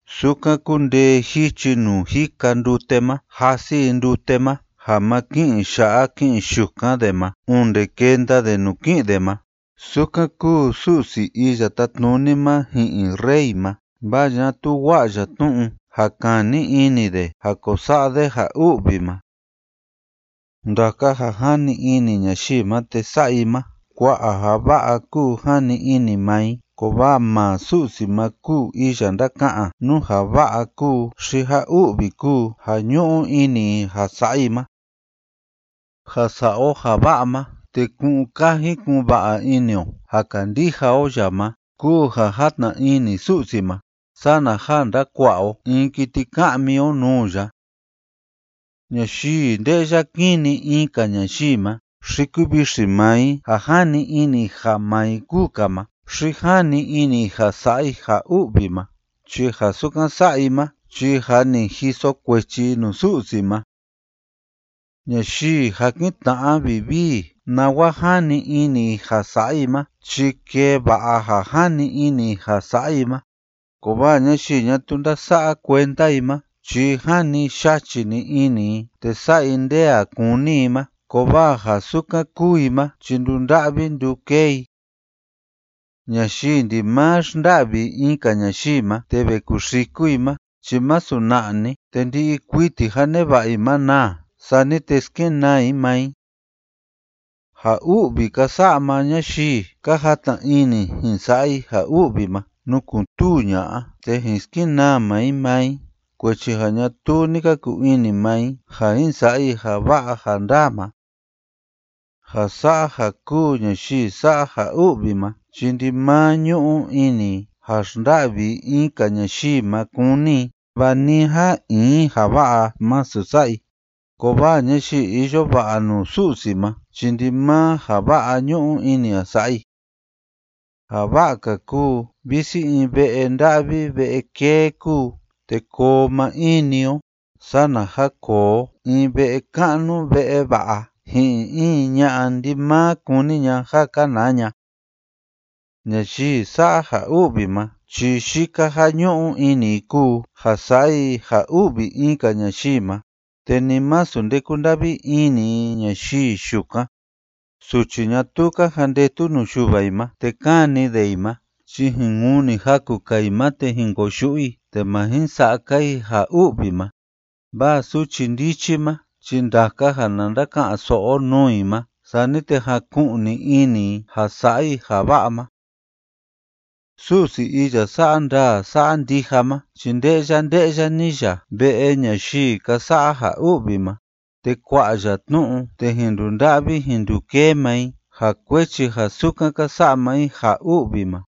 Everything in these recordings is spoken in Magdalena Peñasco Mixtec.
Sukan kundee jichi nuu jika ndute ma jasi i ndute ma ja ma ki'in ya'a ki'in yukan de ma onde kenda de nuu ki'in de ma, sukan kúu Su'si Iya Tátnuni ma ji'in rey ma, vaa ñatuu wa'a ya tnu'u ja kani ini de ja ko sa'a de ja u'vi ma. Ndaka ja jani ini ñayii ma te sa'a i ma, kua'a ja va'a kúu jani ini maa i, kovaa maa Su'si ma kúu iya ndáka'an nú ja va'a kúu xi ja u'vi kúu ja ñu'u ini i ja sa'a i ma. Ja sa'a o ja va'a ma te ku'un kaji ku'un va'a ini o ja kandija o ya ma kúu ja játna ini Su'si ma, sana ja ndakua'a o in kiti ka'mi o nuu ya. Ñayii nde'ya kini in‑ka ñayii ma xi kuvixi maa i ja jani ini i ja maa i kúu‑ka ma xi jani ini i ja sa'a i ja u'vi ma, chi ja sukan sa'a i ma chi jâ ni jiso kuechi i nuu Su'si ma. Ñayii jakin tna'a vivii nawa jani ini i ja sa'a i ma chi kee va'a ja jani ini i ja sa'a i ma, kovaa ñayii ñatuu ndása'a kuenda i ma chi jani yachi‑ni ini i te sa'a i nde a kúni i ma, kovaa ja sukan kúu i ma chi ndunda'vi ndukee i. Ñayii ndimaa xnda'vi in‑ka ñayii ma te ve kuxiku i ma chi masu na'a‑ni te ndi'i kuiti ja neva'a i ma naa, sani te skenaa i maa i. Ja u'vi ka sa'a maa ñayii ka játna ini jin sa'a i ja u'vi ma nukun‑tuu ña'a, te jin skenaa maa i maa i, kuechi ja ñatuu ni ka kuu ini maa i ja jin sa'a i ja va'a ja ndaa ma. Ja sa'a ja kúu ñayii sa'a ja u'vi ma chi ndimaa ñu'u ini i ja xnda'vi i in‑ka ñayii ma kúni i, vaa ni a in ja va'a masu sa'a i, kovaa ñayii iyo va'a nuu Su'si ma chi ndimaa ja va'a ñu'u ini i ja sa'a i. Ja va'a‑ka kúu visi in ve'e nda'vi ve'e kee kúu te koo maa in‑ni o, sana ja koo o in ve'e ka'nu ve'e va'a ji'in in ña'a ndimaa kúni ña ja kanaa ña. Ñayii sa'a ja u'vi ma chi yika ja ñu'u ini i kúu ja sa'a i ja u'vi in‑ka ñayii ma, te ni masu nde kúnda'vi ini i ñayii yukan. Suchi ñatuu ka jandetu nuu yuva i ma te káni de i ma chi jin kuni jaku‑ka i ma te jin koyu'u i, te ma jin sa'a‑ka i ja u'vi ma, vaa suchi ndichi ma chi ndaka ja na ndaka'an‑so'o o nuu i ma, sani te jaku'ni ini i ja sa'a i ja va'a ma. Su'si iya sa'a ndaa sa'a ndija ma chi nde'ya nde'ya‑ni ya ve'e ñayii ka sa'a ja u'vi ma, te kua'a ya tnu'u te jin ndunda'vi jin ndukee maa i ja kuechi ja sukan ka sa'a maa i ja u'vi ma.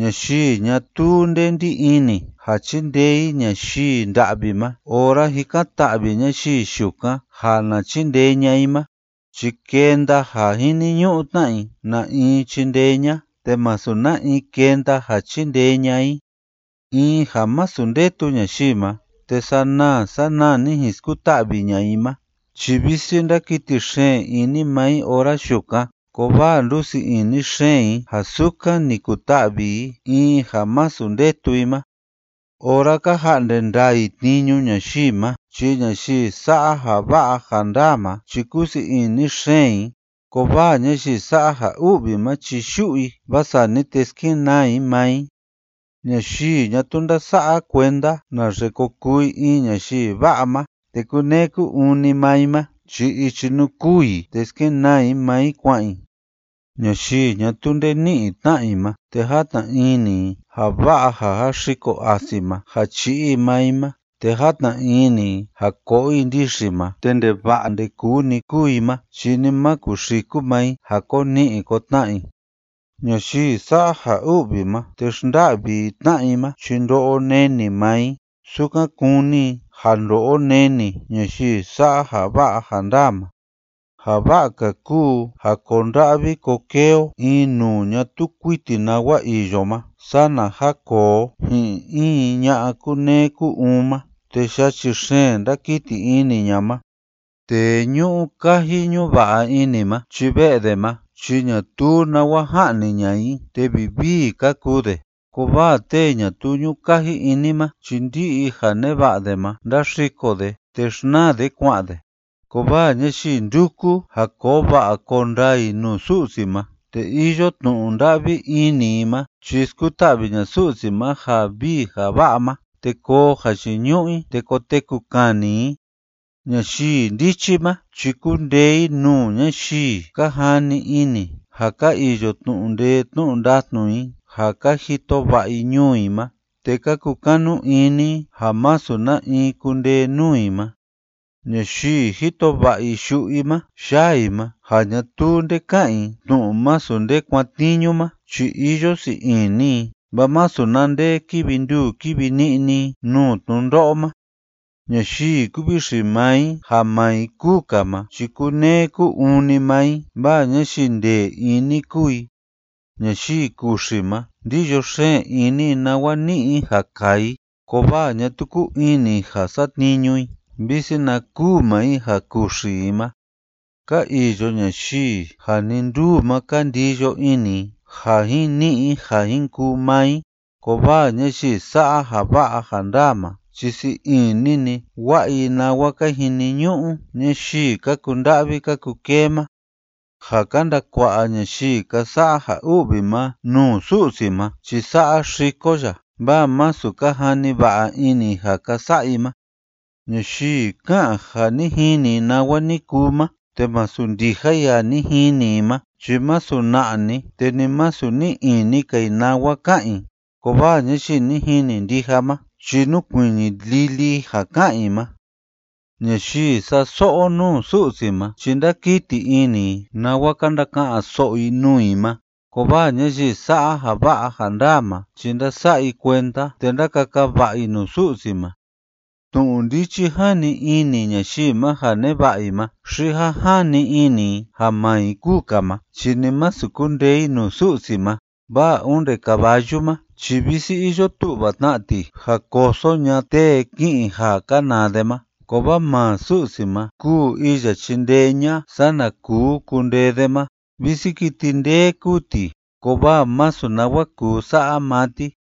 Ñayii ñatuu nde ndí ini ja chindee i ñayii nda'vi ma ora jikan‑ta'vi ñayii yukan ja na chindee ña'a i ma chi kenda ja jiniñu'u tna i na in chindee ña'a, te masu na in kenda ja chindee ña'a i. In ja masu ndetu ñayii ma, te sanaa sanaa‑ni jin skuta'vi ña'a i ma chi visi ndákiti xeen ini maa i ora yukan, kovaa ndusii ini xeen i ja sukan ni kuta'vi i in ja masu ndetu i ma. Ora ka ja'nde ndaa i tniñu ñayii ma chi ñayii sa'a ja va'a ja ndaa ma chi kúsii ini xeen i, kovaa ñayii sa'a ja u'vi ma chi yu'u i, vaa sani te skenaa i maa i. Ñayii ñatuu ndása'a kuenda naxe ko kuu i in ñayii va'a ma te kúneé kú‑uun‑ni maa i ma chi ichi nuu kûu i te skenaa i maa i kua'an i. Ñayii ñatuu nde ni'i tna'a i ma te játna ini i ja va'a ja jaxiko asi ma ja chi'i i maa i ma te játna ini i ja ko'o i ndixi ma te ndeva'a ndekuu‑ni kúu i ma chi ni ma kuxiku maa i ja ko ni'i ko tna'a i. Ñayii sa'a ja u'vi ma te xnda'vi i tna'a i ma chi ndo'o neni maa i sukan kúni i ja ndo'o neni ñayii sa'a ja va'a ja ndaa ma. Ja va'a‑ka kúu ja koo nda'vi koo kee o in nuu ñatuu kuiti nawa iyo ma sana ja koo o ji'in in ña'a kúneé kú‑uun ma te yachi xeen ndákiti ini ña ma. Tee ñu'u kaji ñu'u va'a ini ma chi ve'e de ma chi ñatuu nawa ja'ni ña'a i te vivii ka kuu de, kovaa tee ñatuu ñu'u kaji ini ma chi ndi'i ja neva'a de ma ndáxiko de te xnaa de kua'an de. Kovaa ñayii ndúku ja koo va'a koo ndaa i nuu Su'si ma te iyo tnu'u nda'vi ini i ma, chi skuta'vi ña'a Su'si ma ja vii ja va'a ma, te koo jayiñu'u i, te koteku kani i. Ñayii ndichi ma chi kúndee i nuu ñayii ka jani ini ja ka iyo tnu'u ndee tnu'u ndatnu i ja ka jito va'a i ñuu i ma te ka kukanu ini i ja masu na in kundee nuu i ma. Ñayii jito va'a i yu'u i ma yaa i ma ja ñatuu nde ká'an i tnu'u masu nde kuatniñu ma chi iyo sii ini i, vaa masu na nde kívi nduu kívi ni'ni i nuu tnundo'o ma. Ñayii kúvixi maa i ja maa i kúu‑ka ma chi kúneé kú‑uun‑ni maa i, vaa ñayii ndee ini kúu i. Ñayii kuxi ma, ndíyo xeen ini i nawa ni'i i ja kaa i, kovaa ñatuu kúu ini i ja satniñu i visi na kûu maa i ja kuxi i ma. Ka iyo ñayii ja nii nduu ma ka ndiyo ini i ja jin ni'i i ja jin kuu maa i, kovaa ñayii sa'a ja va'a ja ndaa ma chi sii ini‑ni wa'a i nawa ka jiniñu'u ñayii ka kunda'vi ka kukee ma. Ja ka ndakua'a ñayii ka sa'a ja u'vi ma nuu Su'si ma chi saxiko ya, vaa masu ka jani va'a ini i ja ka sa'a i ma. Ñayii ká'an ja ni jini i nawa ni kuu ma te masu ndija i ja ni jini i ma chi masu na'a‑ni te ni masu ni'i ini‑ka i nawa ka'an i, kovaa ñayii ni jini ndija ma chi núkuiñi lili i ja ká'an i ma. Ñayii sa'a so'o nuu Su'si ma chi ndákiti ini i nawa ka ndaka'an‑so'o i nuu i ma, kovaa ñayii sa'a ja va'a ja ndaa ma chi ndása'a i kuenda te ndákaka va'a i nuu Su'si ma. Tnu'u ndichi jani ini ñayii ma ja neva'a i ma xi ja jani ini i ja maa i kúu‑ka ma chi ni masu kundee i nuu Su'si ma, vaa onde caballu ma chi visi iyo tu'va tna ti ja koso ña'a tee ki'in ja kanaa de ma, kovaa maa Su'si ma kúu iya chindee ña'a sana kuu kundee de ma. Visi kiti ndee kúu ti, kovaa masu nawa kuu sa'a maa ti.